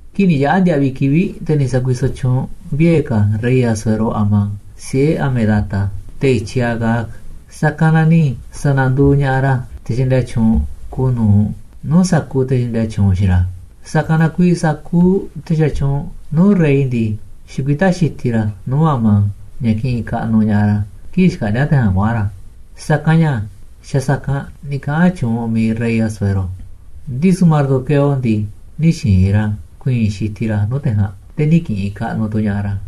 Kii̱ꞌ ni̱ yaꞌa̱ ndiaꞌviꞌ kivi̱ꞌ, te̱ ni̱ sa̱kuisoꞌ tyuunꞌ vie̱ ka̱ rey Asuero Amán, siꞌe̱ Hamedata, te̱ i̱tyiꞌ Agag, sa̱kanꞌ na ni̱ sa̱na̱nduuꞌ ña̱ꞌaꞌ ra̱ te̱ xaꞌndia tyuunꞌ kuuꞌ nu̱uꞌ nuu̱ꞌ sa̱kuuꞌ te̱ xaꞌndia tyuunꞌ xiinꞌ ra̱. Sa̱kanꞌ na kuiiꞌ sa̱kuuꞌ te̱ xatyuunꞌ nuu̱ꞌ rey ndii, xikuitá xitiꞌ ra̱ nuu̱ꞌ Amán, ña̱ kiꞌinꞌ kaꞌnuꞌ ña̱ꞌaꞌ ra̱ kii̱ꞌ xkaꞌndíá te̱ ja̱a̱nꞌ kuaꞌa̱n ra̱. Sa̱kanꞌ ña̱ xa̱ sa̱kanꞌ ni̱ kaꞌa̱n tyuunꞌ mi̱iꞌ rey Asuero. Ndisu̱ Mardoqueo ndii, nï̱ xi̱i̱n ra̱ ku̱i̱i̱n xitiꞌ ra̱ nuu̱ꞌ te̱ ja̱a̱nꞌ, te̱ nï̱ ki̱ꞌi̱n kaꞌnuꞌ tu̱ ña̱ꞌaꞌ ra̱.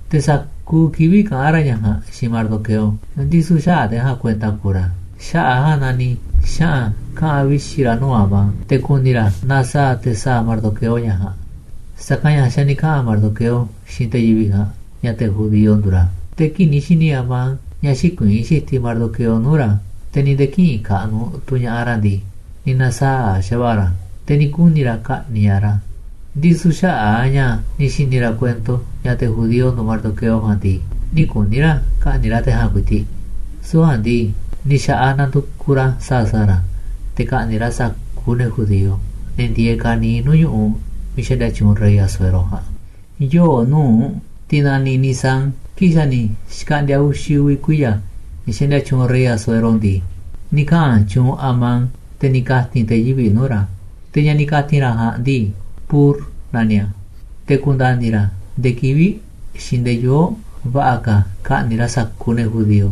Te̱ sa̱kuuꞌ kivi̱ꞌ kaꞌán ra̱ ña̱ ja̱a̱nꞌ xiinꞌ Mardoqueo, ndisu̱ xäaꞌ te̱ ja̱a̱nꞌ kuenta kuuꞌ ra̱. Xaꞌa̱ꞌ a̱ ja̱a̱nꞌ na ni̱ xaꞌa̱n kaꞌa̱n vixi̱ ra̱ nuu̱ꞌ Amán te̱ ku̱ni̱ ra̱ naaꞌ sa̱a̱ te̱ sa̱a̱ Mardoqueo ña̱ ja̱a̱nꞌ, sa̱kanꞌ ña̱ xa̱ ni̱ kaꞌa̱n Mardoqueo xiinꞌ te̱ yivi̱ꞌ ja̱a̱nꞌ ña̱ te̱ judío nduuꞌ ra̱. Te̱ kii̱ꞌ ni̱ xi̱ni̱ Amán ña̱ xïkuiín xitiꞌ Mardoqueo nuu̱ꞌ ra̱, te̱ ni̱ nde̱e̱ kïꞌinꞌ kaꞌnuꞌ tu̱ ña̱ꞌaꞌ ra̱ ndii, ni̱ na̱saa̱ꞌ xa̱va̱ꞌa̱ ra̱. Te̱ ni̱ kuni̱ ra̱ ka̱ꞌni̱ꞌ ña̱ꞌaꞌ ra̱, ndisu̱ xaꞌa̱ꞌ a̱ ña̱ ni̱ xi̱ni̱ ra̱ kuento ña̱ te̱ judío nduuꞌ Mardoqueo ja̱a̱nꞌ ndii, nï̱ kuni̱ ra̱ ka̱ꞌni̱ꞌ ra̱ te̱ ja̱a̱nꞌ ku̱i̱ti̱ꞌ. Süu̱ꞌ ja̱a̱nꞌ ndii, ni̱ xa̱ꞌaꞌ na̱ndu̱kuꞌ ra̱ sa̱a̱ sa̱a̱ ra̱ te̱ ka̱ꞌni̱ꞌ ra̱ sa̱kuuꞌ ne̱ judío, ne̱ ndieeꞌ ka̱niiꞌ nuu̱ꞌ ñu̱ꞌuꞌ miiꞌ xaꞌndia tyuunꞌ rey Asuero ja̱a̱nꞌ. Yoo̱ꞌ nu̱uꞌ, tiꞌ naniꞌ Nisán, kii̱ꞌ xa̱ ni̱ xkaꞌndi̱a̱ uxi̱ uvi̱ kuiya̱ ña̱ xaꞌndia tyuunꞌ rey Asuero ndii, ni̱ kaꞌa̱n tyuunꞌ Amán, te̱ ni̱ ka̱ti̱n te̱ yivi̱ꞌ nuu̱ꞌ ra̱. Te̱ ña̱ ni̱ ka̱ti̱n ra̱ ja̱a̱nꞌ ndii, pur naniꞌ a̱, te̱ ku̱nda̱ni̱ ra̱ ndee kivi̱ꞌ xiinꞌ ndee yoo̱ꞌ va̱ꞌa̱ ka̱ ka̱ꞌni̱ꞌ ra̱ sa̱kuuꞌ ne̱ judío.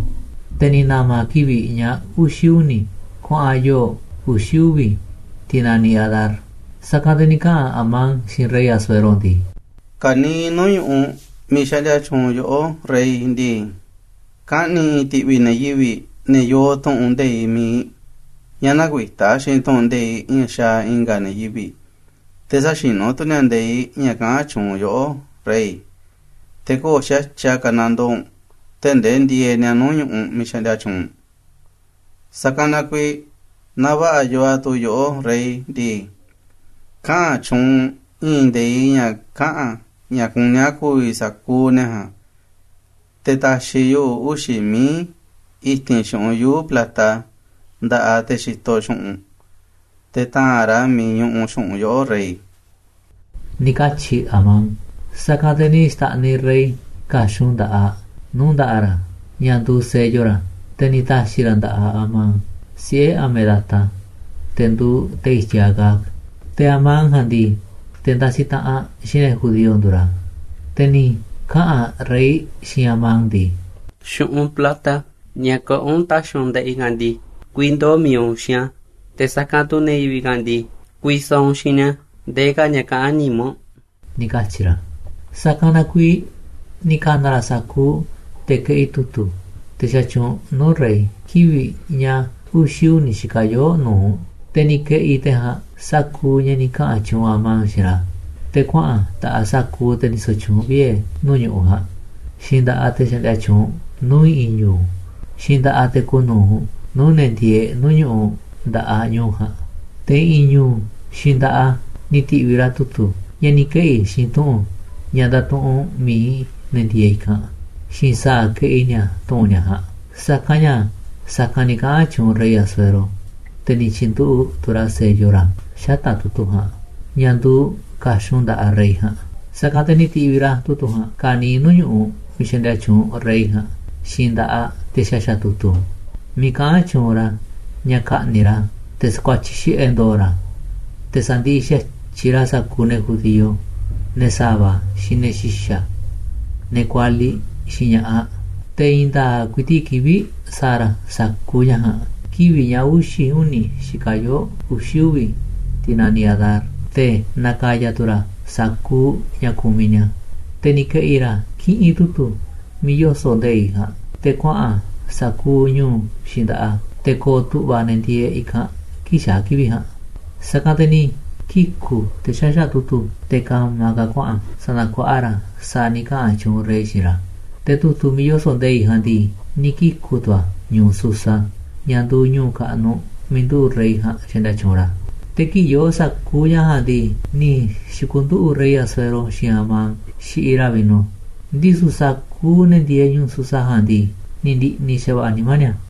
Te̱ ni̱ na̱ma̱ a̱ kivi̱ꞌ ña̱ uxi̱ uni̱ kuaꞌa̱n yoo̱ꞌ uxi̱ uvi̱, tiꞌ naniꞌ Adar. Sa̱kanꞌ te̱ ni̱ kaꞌa̱n Amán xiinꞌ rey Asuero ndii: ―Ka̱niiꞌ nuu̱ꞌ ñu̱ꞌuꞌ miiꞌ xaꞌndia tyuunꞌ yoꞌó, rey ndii, kaꞌni̱ i̱i̱n ti̱ꞌvi̱ ne̱ yivi̱ꞌ, ne̱ yoo tu̱ꞌu̱n nde̱iꞌ mi̱iꞌ ña̱ näkuitá xiinꞌ tu̱ꞌu̱n nde̱iꞌ ña̱ xaaꞌ i̱nga̱ ne̱ yivi̱ꞌ, te̱ säxinú tu̱ ni̱a̱ nde̱iꞌ ña̱ kaꞌán tyuunꞌ yoꞌó, rey. Te̱ köo̱ꞌ xa̱tyiꞌ a̱ ka̱nandoo u̱nꞌ tee̱ꞌ ndee ndieeꞌ ni̱a̱ nuu̱ꞌ ñu̱ꞌuꞌ miiꞌ xaꞌndia tyuunꞌ u̱nꞌ. Sa̱kanꞌ na kuiiꞌ naaꞌ va̱ꞌa̱ yoo a̱ tuu yoꞌó, rey ndii, kaꞌa̱n tyuunꞌ u̱nꞌ i̱i̱n nde̱iꞌ ña̱ kaꞌa̱n ña̱ kuní a̱ ku̱vi̱ sa̱kuuꞌ ne̱ ja̱a̱nꞌ. Te̱ ta̱xi̱ yuꞌu̱ uxi̱ mií i̱ti̱n xu̱ꞌunꞌ yuu̱ꞌ plata nda̱ꞌaꞌ te̱ xitoꞌ xu̱ꞌunꞌ u̱nꞌ, te̱ ta̱a̱nꞌ ra̱ a̱ miiꞌ ñuꞌuꞌ xu̱ꞌunꞌ yoꞌó, rey ―ni̱ katyi̱ Amán. Sa̱kanꞌ te̱ ni̱ xta̱ꞌniꞌ rey ka̱xun nda̱ꞌaꞌ nuu̱ꞌ nda̱ꞌaꞌ ra̱, ña̱ nduuꞌ sello ra̱, te̱ ni̱ ta̱xi̱ ra̱ a̱ nda̱ꞌaꞌ Amán, siꞌe̱ Hamedata, te̱ nduuꞌ te̱ i̱tyiꞌ Agag. Te̱ Amán ja̱a̱nꞌ ndii, te̱ ndasiꞌ taꞌanꞌ xiinꞌ ne̱ judío nduuꞌ ra̱. Te̱ ni̱ kaꞌa̱n rey xiinꞌ Amán ndii: ―Xu̱ꞌunꞌ plata ña̱ kaꞌán u̱nꞌ ta̱xi̱ u̱nꞌ nda̱ꞌaꞌ i̱ ja̱a̱nꞌ ndii, ku̱vi̱ ndoo̱ mi̱iꞌ u̱nꞌ xiinꞌ a̱. Te̱ sa̱kanꞌ tu̱ ne̱ yivi̱ꞌ ja̱a̱nꞌ ndii, ku̱vi̱ sa̱a̱ u̱nꞌ xiinꞌ ni̱a̱ ndee ka̱ ña̱ kaꞌán nimá u̱nꞌ ―ni̱ katyi̱ ra̱. Sa̱kanꞌ na kuiiꞌ ni̱ ka̱na̱ ra̱ sa̱kuuꞌ te̱ keꞌi tu̱tu̱, te̱ xatyuunꞌ nuu̱ꞌ rey, kivi̱ꞌ ña̱ uxi̱ uni̱ xikaꞌ yoo̱ꞌ nu̱uꞌ. Te̱ ni̱ ke̱ꞌi̱ te̱ ja̱a̱nꞌ sa̱kuuꞌ ña̱ ni̱ kaꞌa̱n tyuunꞌ Amán xiinꞌ ra̱, te̱ kuaꞌa̱n a̱ nda̱ꞌaꞌ sa̱kuuꞌ te̱ ndisoꞌ tyuunꞌ vie̱ nuu̱ꞌ ñu̱ꞌuꞌ ja̱a̱nꞌ, xiinꞌ nda̱ꞌaꞌ te̱ xaꞌndia tyuunꞌ nuu̱ꞌ i̱ꞌi̱n ñu̱u̱, xiinꞌ nda̱ꞌaꞌ te̱ kuuꞌ nu̱uꞌ nuu̱ꞌ ne̱ ndieeꞌ nuu̱ꞌ ñu̱ꞌuꞌ nda̱ꞌaꞌ ñu̱u̱ ja̱a̱nꞌ. Te̱ i̱ꞌi̱n ñu̱u̱ xiinꞌ nda̱ꞌaꞌ a̱ ni̱ ti̱ꞌviꞌ ra̱ tu̱tu̱ ña̱ ni̱ keꞌi̱ xiinꞌ tu̱ꞌu̱n ña̱ ndatuꞌunꞌ mi̱iꞌ ne̱ ndieeꞌ i̱kanꞌ, xiinꞌ sa̱a̱ keꞌi ni̱a̱ tu̱ꞌu̱n ni̱a̱ ja̱a̱nꞌ. Sa̱kanꞌ ña̱ sa̱kanꞌ ni̱ kaꞌa̱n tyuunꞌ rey Asuero, te̱ ni̱ tyi̱nduꞌu̱ꞌ tu̱ ra̱ sello ra̱ xata̱ꞌ tu̱tu̱ ja̱a̱nꞌ, ña̱ nduuꞌ ka̱xun nda̱ꞌaꞌ rey ja̱a̱nꞌ. Sa̱kanꞌ te̱ ni̱ ti̱ꞌviꞌ ra̱ tu̱tu̱ ja̱a̱nꞌ ka̱niiꞌ nuu̱ꞌ ñu̱ꞌuꞌ miiꞌ xaꞌndia tyuunꞌ rey ja̱a̱nꞌ xiinꞌ nda̱ꞌaꞌ te̱ xaxa̱ꞌ tu̱tu̱, miiꞌ kaꞌán tyuunꞌ ra̱ ña̱ ka̱ꞌni̱ꞌ ra̱, te̱ sa̱kuatyiꞌ xiꞌe̱ ndo̱o̱ ra̱, te̱ sa̱ndiꞌiꞌ xa̱tyiꞌ ra̱ sa̱kuuꞌ ne̱ judío, ne̱ sa̱va̱, xiinꞌ ne̱ xi̱xa̱, ne̱ kualiꞌ, xiinꞌ ña̱ꞌaꞌ. Te̱ i̱i̱n nda̱a̱ꞌ ku̱i̱ti̱ꞌ kivi̱ꞌ sa̱a̱ ra̱ sa̱kuuꞌ ña̱ ja̱a̱nꞌ, kivi̱ꞌ ña̱ uxi̱ uni̱ xikaꞌ yoo̱ꞌ uxi̱ uvi̱, tiꞌ naniꞌ Adar. Te̱ na̱ka̱ya̱ tu̱ ra̱ sa̱kuuꞌ ña̱ kumiꞌ ni̱a̱. Te̱ ni̱ ke̱ꞌi̱ ra̱ kiꞌinꞌ tu̱tu̱ miiꞌ yoso̱ꞌ nde̱iꞌ ja̱a̱nꞌ te̱ kuaꞌa̱n a̱ sa̱kuuꞌ ñu̱u̱ xiinꞌ nda̱ꞌaꞌ a̱, te̱ ko̱o̱ tu̱ꞌva̱ ne̱ ndieeꞌ i̱kanꞌ kii̱ꞌ xaa̱ kivi̱ꞌ ja̱a̱nꞌ. Sa̱kanꞌ te̱ ni̱ kiku̱ te̱ xaxa̱ꞌ tu̱tu̱, te̱ ka̱ma̱ ka̱ kuaꞌa̱n sa̱na̱kuaꞌa ra̱ a̱ sa̱a̱ ni̱ kaꞌa̱n tyuunꞌ rey xiinꞌ ra̱. Te̱ tu̱tu̱ miiꞌ yoso̱ꞌ nde̱iꞌ ja̱a̱nꞌ ndii, ni̱ kiku̱ tu̱ a̱ ñu̱u̱ Susa, ña̱ nduuꞌ ñu̱u̱ kaꞌnuꞌ miiꞌ nduꞌu̱ꞌ rey ja̱a̱nꞌ xaꞌndia tyuunꞌ ra̱. Te̱ kii̱ꞌ yoo sa̱kuuꞌ ña̱ ja̱a̱nꞌ ndii, ni̱ xi̱ku̱nduꞌu̱ꞌ rey Asuero xiinꞌ Amán xiꞌiꞌ ra̱ vino, ndisu̱ sa̱kuuꞌ ne̱ ndieeꞌ ñu̱u̱ Susa ja̱a̱nꞌ ndii, ni̱ ndi̱ꞌni̱ xa̱va̱ꞌa̱ nimá ni̱a̱.